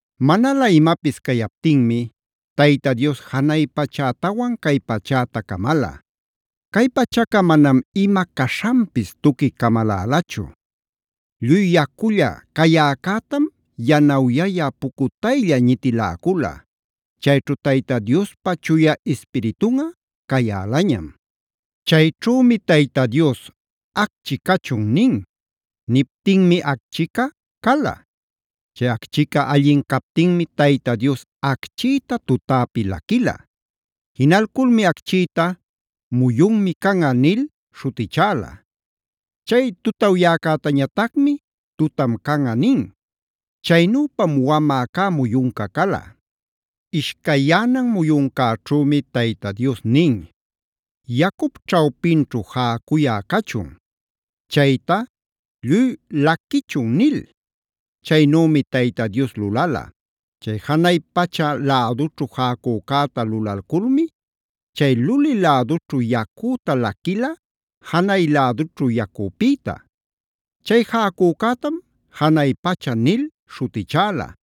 Manalä imapis cayaptinmi, Tayta Dios janay pachätawan cay pachätaa camala. Cay pachaca manam ima caśhanpis tuqui camalälachu; lluy yaculla cayäcätam yanawyayä pucutaylla ñitiläcula. Chayćhu Tayta Diospa Chuya Ispiritunꞌa cayälañam. Chayćhümi Tayta Dios “Acchi cachun” nin.b Niptinmi acchica cala. Chay acchica allin captinmi, Tayta Dios acchïta tutäpi laquila. Jinalculmi acchïta “muyunmi canꞌa” nil śhutichäla. Chay tutawyäcätañatacmi “tutam canꞌa” nin. Chaynüpam wamä cä muyunca cala. Ishcayyänan muyuncäćhümi Tayta Dios nin: “Yacup ćhawpinćhu jäcuyä cachun; chayta lluy laquichun” nil. Chaynümi Tayta Dios lulala: chay janay pacha lädućhu jäcücäta lulalculmi chay luli lädućhu yacüta laquila janay lädućhu yacupïta. Chay jäcücätam “janay pacha” nil śhutichäla.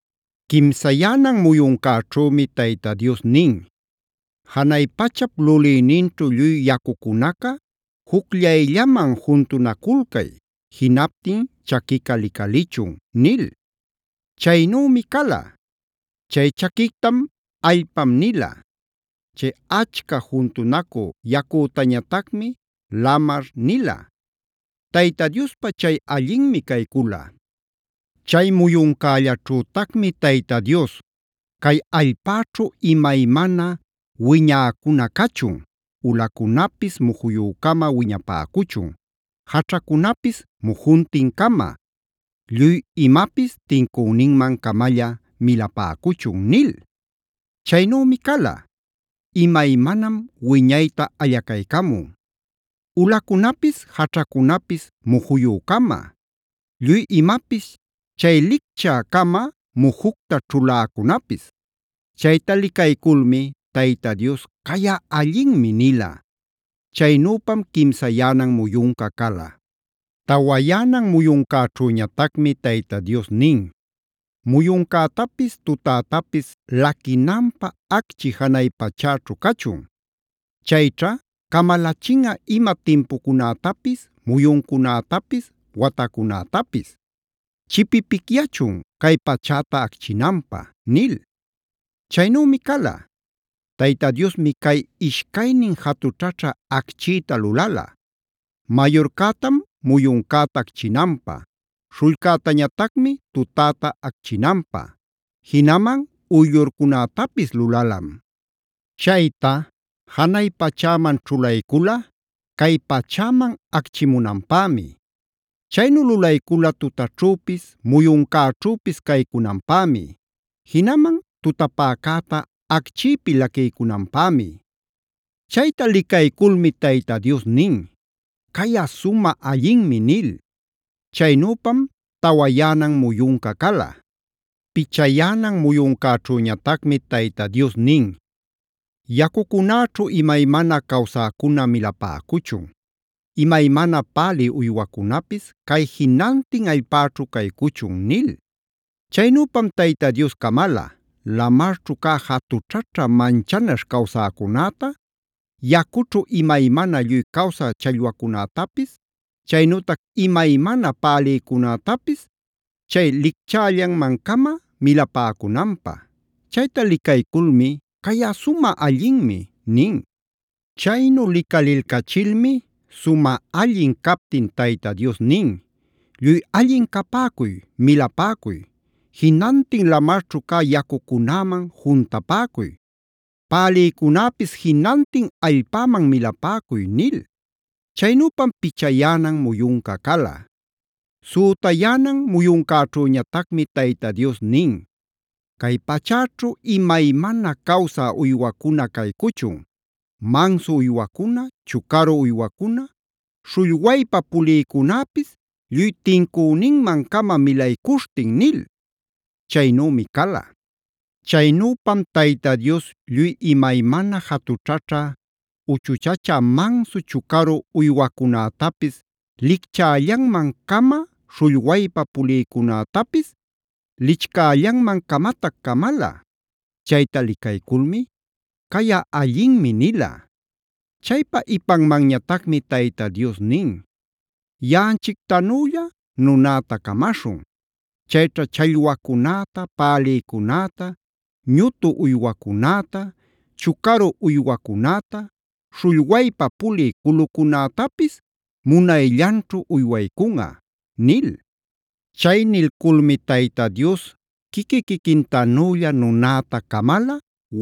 Quimsayänan muyuncäćhümi Tayta Dios nin: “Janay pachap lulïninćhu lluy yacucunaca jucllayllaman juntunaculcay, jinaptin chaquica licalichun” nil. Chaynümi cala. Chay chaquictam “allpam” nila. Chay achca juntunacü yacütañatacmi “lamar” nila. Tayta Diospä chay allinmi caycula. Chay muyuncällaćhütacmi Tayta Dios: “Cay allpäćhu imaymana wiñäcuna cachun, ulacunapis mujuyü-cama wiñapäcuchun, jaćhacunapis mujuntin-cama, lluy imapis tincüninman-camalla milapäcuchun” nil. Chaynümi cala. Imaymanam wiñayta allacaycamun: ulacunapis jaćhacunapis mujuyü-cama, lluy imapis chay licchä-cama mujucta ćhuläcunapis. Chayta licayculmi Tayta Dios: “Cayꞌa allinmi” nila. Chaynüpam quimsayänan muyunca cala. Tawayänan muyuncäćhüñatacmi Tayta Dios nin: “Muyuncätapis tutätapis laquinanpä acchi janay pachäćhu cachun. Chayćha camalachinꞌa ima timpucunätapis, muyuncunätapis, watacunätapis; chipipicyachun cay pachäta acchinanpä” nil. Chaynümi cala. Tayta Diosmi cay ishcaynin jatućhaćhä acchïta lulala. Mayurcätam muyuncäta acchinanpä, śhullcätañatacmi tutäta acchinanpä; jinaman uyllurcunätapis lulalam. Chayta janay pachäman ćhulaycula cay pachäman acchimunanpämi. Chaynu lulaycula tutaćhüpis muyuncäćhüpis caycunanpämi; jinaman tutapäcäta acchïpi laquiycunanpämi. Chayta licayculmi Tayta Dios nin: “Cayꞌa sumä allinmi” nil. Chaynüpam tawayänan muyunca cala. Pichayänan muyuncäćhüñatacmi Tayta Dios nin: “Yacucunäćhu imaymana cawsäcuna milapäcuchun, imaymana pälï uywacunapis cay jinantin allpäćhu caycuchun” nil. Chaynüpam Tayta Dios camala: lamarćhu cä jatućhaćha manchanaśh cawsäcunäta, yacućhu imaymana lluy cawsä challwacunätapis, chaynütac imaymana pälïcunätapis chay licchällanman-cama milapäcunanpä. Chayta licayculmi: “Cayꞌa sumä allinmi” nin. Chaynu licalilcachilmi sumä allin captin Tayta Dios nin: “Lluy allin capäcuy, milapäcuy; jinantin lamarćhu cä yacucunäman juntapäcuy. Pälïcunäpis jinantin allpäman milapäcuy” nil. Chaynüpam pichayänan muyunca cala. Sütayänan muyuncäćhüñatacmi Tayta Dios nin: “Cay pachäćhu imaymana cawsä uywacuna caycuchun: mansu uywacuna, chucaru uywacuna, śhullwaypa pulïcunäpis lluy tincüninman-cama milaycuśhtin” nil. Chaynümi cala. Chaynüpam Tayta Dios lluy imaymana jatućhaćhä uchuchachä mansu chucaru uywacunätapis lichcällanman-cama, śhullwaypa pulïcunätapis lichcällanman-camatac camala. Chayta licayculmi “Cayꞌa allinmi” nila. Chaypa ipanmanñatacmi Tayta Dios nin: “Yaꞌanchictanüllae nunäta camaśhun. Chayćha challwacunäta, pälïcunäta, ñutu uywacunäta, chucaru uywacunäta, śhullwaypa pulï culucunätapisd munayllanćhu uywaycunꞌa” nil. Chay nilculmi Tayta Dios quiqui-quiquintanülla nunäta camala;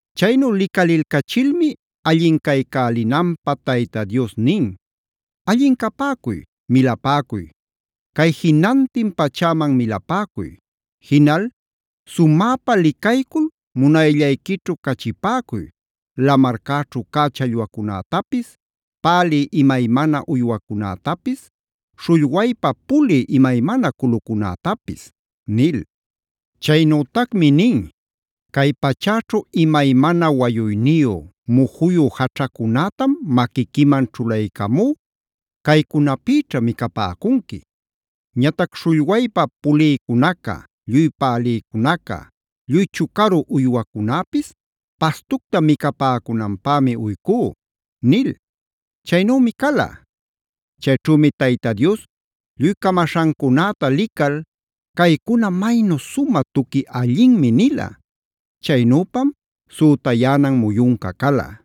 Chaynu licalilcachilmi allin caycälinanpäg Tayta Dios nin: “Allin capäcuy, milapäcuy; cay jinantin pachäman milapäcuy. Jinal sumäpa licaycul munayllayquićhu cachipäcuy; lamarcäćhu cä challwacunätapis, pälï imaymana uywacunätapis, śhullwayllap pulï imaymana culucunätapis” nil. Chaynütacmi nin: “Cay pachäćhu imaymana wayuyniyu, mujuyu jaćhacunätam maquiquiman ćhulaycamú; caycunapïćha micapäcunqui. “Ñatac śhullwaypa pulïcunaca, lluy pälïcunaca, lluy chucaru uywacunäpis pastucta micapäcunanpämi uycú” nil. Chaynümi cala. Chayćhümi Tayta Dios lluy camaśhancunäta lical: “Caycuna maynu sumä tuqui allinmi” nila. Chaynüpam sütayänan muyunca cala.